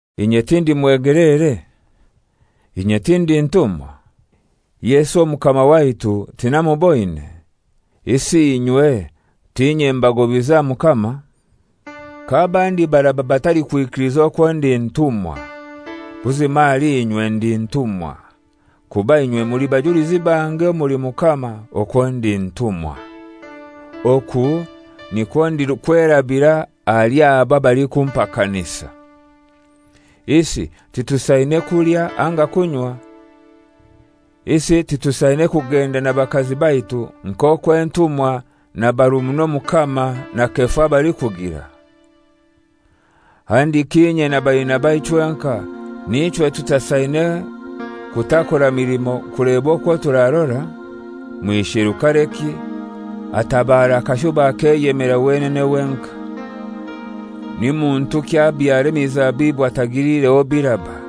Inye tindi mwegeleere? Inye tindi ntumwa? Yesu Omukama waitu tinamuboine? Isi inywe t'inye mbagobize aha Mukama? K'abandi baraba batalikwikiliza okwo ndi ntumwa, buzima ahali inywe ndi ntumwa. Kuba inywe muli bajulizi bange omuli Mukama okwo ndi ntumwa. Oku nikwo ndikwerabira ahali abo abalikumpakanisa. Isi titusaine kulya anga kunywa? Isi titusaine kugenda na bakazi baitu nk'okwo entumwa na barumuna Omukama na Kefa balikugira? Handiki inye na Barinaba chwenkai n'ichwe tutasaine kutakora milimo kuleba okwo turarora? Mwisherukareki atabara akashuba akeyemera wenene wenkai? Ni muntuki abyara emizabibu atagiliireho biraba?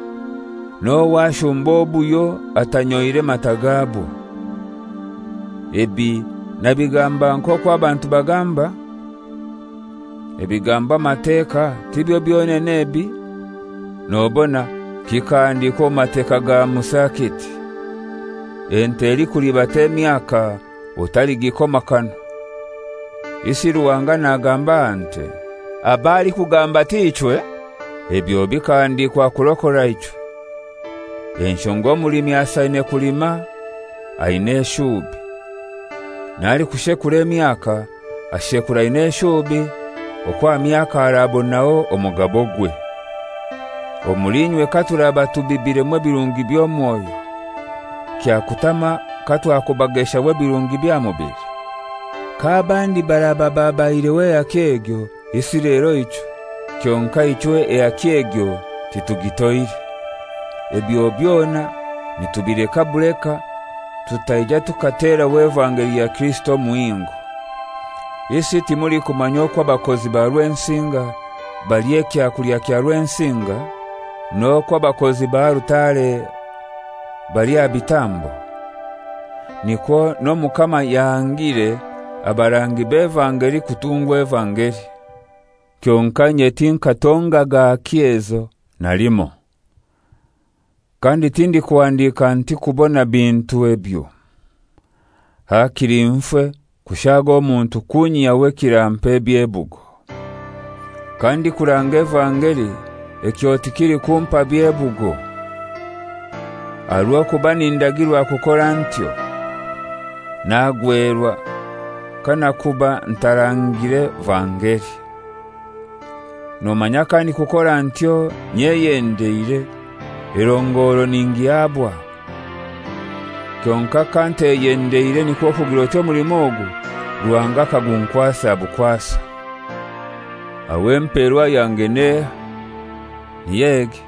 N'ohai ashumba obuhyo atanyoire matai gabwo? Ebi nabigamba nk'okwo abantu bagamba? Ebigambwa amateka tibyo byonene ebi? Nobona kikahandiikwa omu Mateka ga Musa kiti, «Ente elikulibata emyaka otaligikoma kanwa.» Isi Ruhanga nagamba aha nte? Ab'alikugamba t'ichwe? Ebyo bikahandikwa kurokora ichwe, enshonga omulimi asaine kulima aina eshuubi, n'alikushekura emyaka ashekura aina eshuubi okwo aha myaka arabonaho omugabogwe. Omuli inywe katuraba tubibiremu ebirungi by'omwoyo, kyakutama katwakubageshaho ebirungi by'aha mubili? K'abandi baraba babaihireho ehaki egyo, isi lero ichwe? Kyonkai ichwe ehaki egyo titugitoire, ebyo byona nitubileka buleka tutaija tukateraho evangeli ya Kirisito omuhingo. Isi timulikumanya okwo abakozi ba Rwensinga balya ekyakulya kya Rwensinga? N'okwo abakozi ba alutare balya aha bitambo? Nikwo n'Omukama yahangire abarangi b'evangeli kutungwa evangeli. Kyonkai inye tinkatongaga haki ezo na limoi. Kandi tindikuhandiika nti kubona bintu ebyo. Hakili nfe kushaaga omuntu kunyihyaho ekirampa ebyebugo. Kandikuranga evangeli ekyo tikilikumpa byebugo, aha rw'okuba nindagirwa kukora ntyo. Nagwerwa kanakuuba ntaarangile vangeli! Nomanya kandikukora ntyo nyeyendeire, erongoro ningihabwa. Kyonkai kanteyendeire nikwo kugir'oti omulimo ogu Ruhanga akagunkwasa bukwasa. Aho emperwa yange n'ehai? Niy'egi: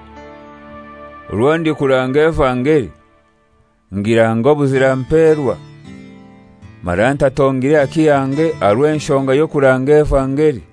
Orwo ndikuranga evangeli, ngirange obuzira mperwa, mara ntatongire haki yange aha rw'enshonga y'okuranga evangeli.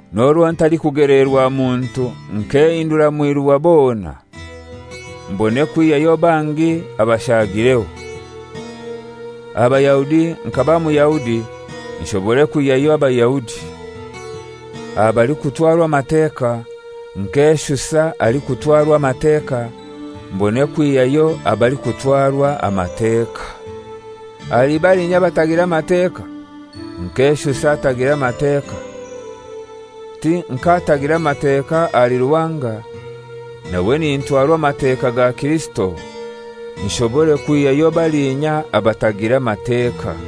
N'orwo ntalikugeleerwa muntu nkehindura mwiru wa bona, mbone kwihyayo bangi abashagireho. Aha Bayahudi nkaba Muyahudi nshobore kwihayo Abayahudi. Aha balikutwarwa Amateka nkeshusa alikutwarwa Amateka mbone kwihayo abalikutwarwa Amateka. Ahali balinya abatagira Mateka nkeshusa atagira Mateka, ti nk'atagira Mateka ahali Ruhanga, nawe nintwarwa Amateka ga Kirisito, nshobore kwihyayo balinya abatagira Mateka.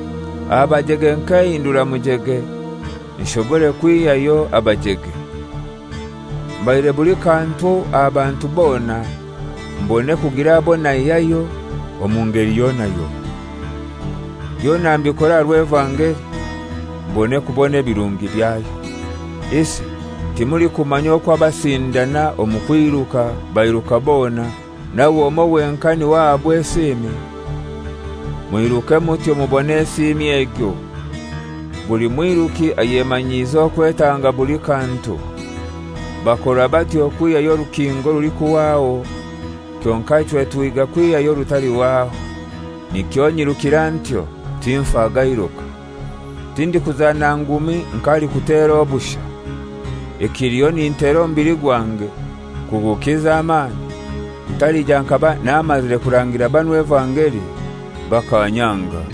Aha bajege nkehindura mujege, nshobore kwihayo abajege. Mbaire buli kantu aha bantu bona, mbone kugira abo naihayo omu ngeli yona yona. Byona mbikora aha rw'evangeli, mbone kubona ebirungi byayo. Isi timulikumanya okwo abasindana omu kwiruka bairuka bona, nawe omoi wenkai n'iwe ahabwa esiimi? Mwiruke mutyo mubone esiimi egyo. Buli mwiruki ayemanyiiza okwetanga buli kantu. Bakora batyo kwihyayo orukinga orulikuhwaho, kyonkai ichwe tuhiiga kwihyayo orutalihwaho. Nikyo nyirukira ntyo, tinfa gairuka; tindikuzana ngumi nk'alikutera obushai. Ekiliho nintera omubili gwange kugukiza amani, ntalija nkaba namazire kurangira banu evangeli bakanyanga.